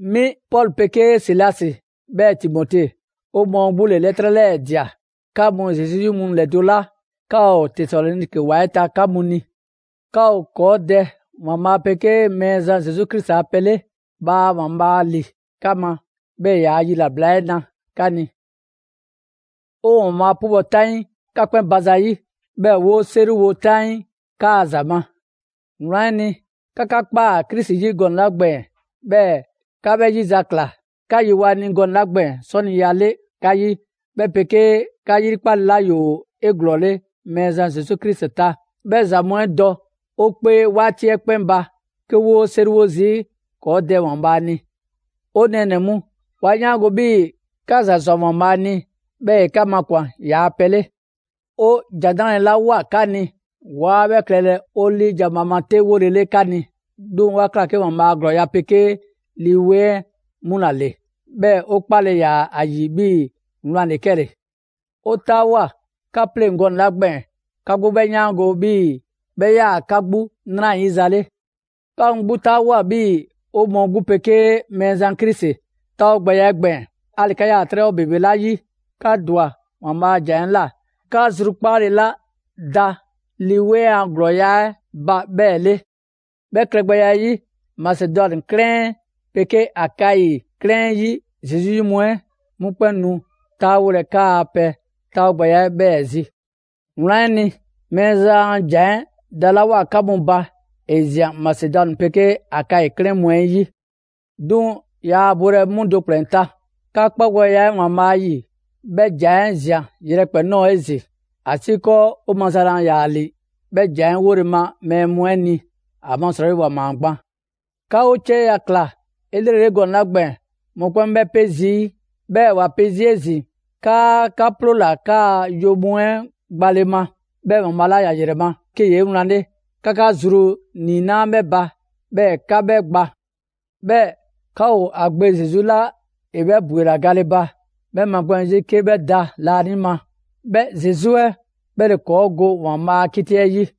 'Mi Pɔlu 'pegee Silasi 'bhɛɛ‑ Timote, 'o mɔɔ 'gbu ‑le 'lɛtrɛ 'lɛɛ‑ ꞊dia 'ka mu Zesu 'yi mu ‑lɛdo' 'la 'ka ‑o Tesaloniki ‑wa 'ɛ ta 'ka mu ni. 'Ka ‑o ‑kɔɔ' Dɛ ‑Waanbhaa' 'pegee Mɛɛzan Zesu Krisi a pɛ 'le. Bhaa ‑Waanbhaa' ‑li 'ka ma, 'bhɛɛ‑ ‑e ‑yaa' yilabla 'ɛ na 'ka ni. 'O ‑Waanbhaa' 'pubɔ‑ 'taŋii 'ka 'kpɛn ba zayi', 'bhɛɛ‑ 'woo‑ 'seriwo 'taŋii 'kaa‑ ‑za ma. Wlan 'ɛ ni, 'ka 'ka ꞊kpaa Krisi 'yi gɔnɛ‑ 'la gbɛɛn‑, 'bhɛɛ‑ 'ka 'bhɛ 'yizakla; 'ka yewoa‑ ‑a ni gɔnɛ‑ 'la gbɛɛn‑ 'sɔniya 'le 'ka 'yi, 'bhɛ 'pegee 'ka 'yrikpale 'la ‑yoo 'eglɔɔle Mɛɛzan Zesu Krisi ta; 'bhɛ ‑za mu 'ɛ dɔ 'o 'kpee 'waati 'ɛ 'kpɛn ba 'ke 'woo‑ 'seriwo zii' ‑kɔɔ' Dɛ ‑Waanbhaa' ni. 'O nɛɛnɛ‑ mu, 'wa 'yaango‑ 'bhii‑ 'ka ‑za ꞊swa ‑Waanbhaa' ni, 'bhɛɛ‑ ‑e 'ka makwan‑ yaa pɛ 'le. 'O ‑Jan 'Nrale‑ 'la ꞊woa 'ka ni; 'waa 'bhɛ klɛlɛ 'o 'liijan‑ bhaama 'te 'wolele 'ka ni, 'duŋ‑ 'wa ꞊kla 'ke ‑Waanbhaa' a ‑glɔɔya' 'pegee Lii 'Weŋ 'ɛ 'mu ‑la ‑le. 'Bhɛɛ‑ 'o 'kpale‑ ‑yaa ‑a ‑yi 'bhii‑ wlan ‑le 'kɛle‑. 'O 'taawoa꞊ 'ka 'pleŋ‑ gɔnɛ‑ 'la gbɛɛn‑ 'ka 'gbu 'bhɛ 'yaango‑ 'bhii‑ 'bhɛ 'yaa‑ 'ka 'gbu 'nrayiza 'le. 'Ka mu 'gbu 'taawoa꞊ 'bhii‑ 'o mɔɔ 'gbu 'pegee Mɛɛzan Krisi 'taawogbɛya 'ɛ gbɛɛn‑. 'Ali‑ 'ka 'yaa‑ 'trɛbhɔ ‑bebe 'la 'yi, 'ka ‑dwa ‑Waanbhaa' a ‑jan 'ɛ ꞊la 'ka zrukpaale 'la da Lii 'Weŋ a ‑glɔɔya' 'ɛ ba 'bhɛɛ‑ 'le. 'Bhɛ klɛgbɛya 'ɛ 'yi, Masedwani 'klɛɛn 'ɛ 'pegee Akayi 'klɛɛn 'ɛ 'yi Zesu 'yi mu 'ɛ, 'mu 'kpɛn nu 'taawolɛ 'kaa‑ pɛ 'taawogbɛya 'ɛ 'bhɛɛ‑ zi. Wlan 'ɛ ni, Mɛɛzan a ‑Jan 'ɛ dalawoa 'ka mu ba, ‑e ꞊zian Masedwani 'pegee Akayi 'klɛɛn mu 'ɛ 'yi; 'duŋ‑ yaa bolɛ 'mu do ‑kplɛn ta; 'ka 'kpagbɛya 'ɛ ‑Waanbhaa' 'yi, 'bhɛ ‑jan 'ɛ ꞊zian yrɛkpɛn‑ ꞊nɔɔ 'ezin‑, ‑asiikɔɔ 'o maza laa ‑yaa ‑li 'bhɛ ‑jan 'ɛ 'wole‑ ma mɛɛ mu 'ɛ ni, ‑amasrɔyi ‑wa ‑maa gban. 'Ka 'o 'cieya‑ ꞊kla 'elrele gɔnɛ‑ 'la gbɛɛn‑, mɔkpɛn' ‑o 'bhɛ 'pe zii'. 'Bhɛɛ‑ ‑wa pe zii' 'ezin‑ 'kaa 'ka 'ploola‑ 'kaa yo mu 'ɛ gbale ma, 'bhɛɛ‑ ‑Waanbhaa' 'la ‑ya ‑yrɛ ma, 'ke ‑yee' 'ewlanle, 'ka 'ka zru ‑niinaa' 'bhɛ ba, 'bhɛɛ‑ 'ka 'bhɛ gba. 'Bhɛɛ‑ 'ka ‑o ‑a Gbe Zesu 'la ‑e 'bhɛ ‑bwela gale ba, 'bhɛ 'magbɛn‑ 'zi 'ke 'bhɛ da laanima. 'Bhɛ Zesu 'ɛ, 'bhɛ ‑le ‑kɔɔ' go ‑Waanbhaa' a 'kiti 'ɛ 'yi.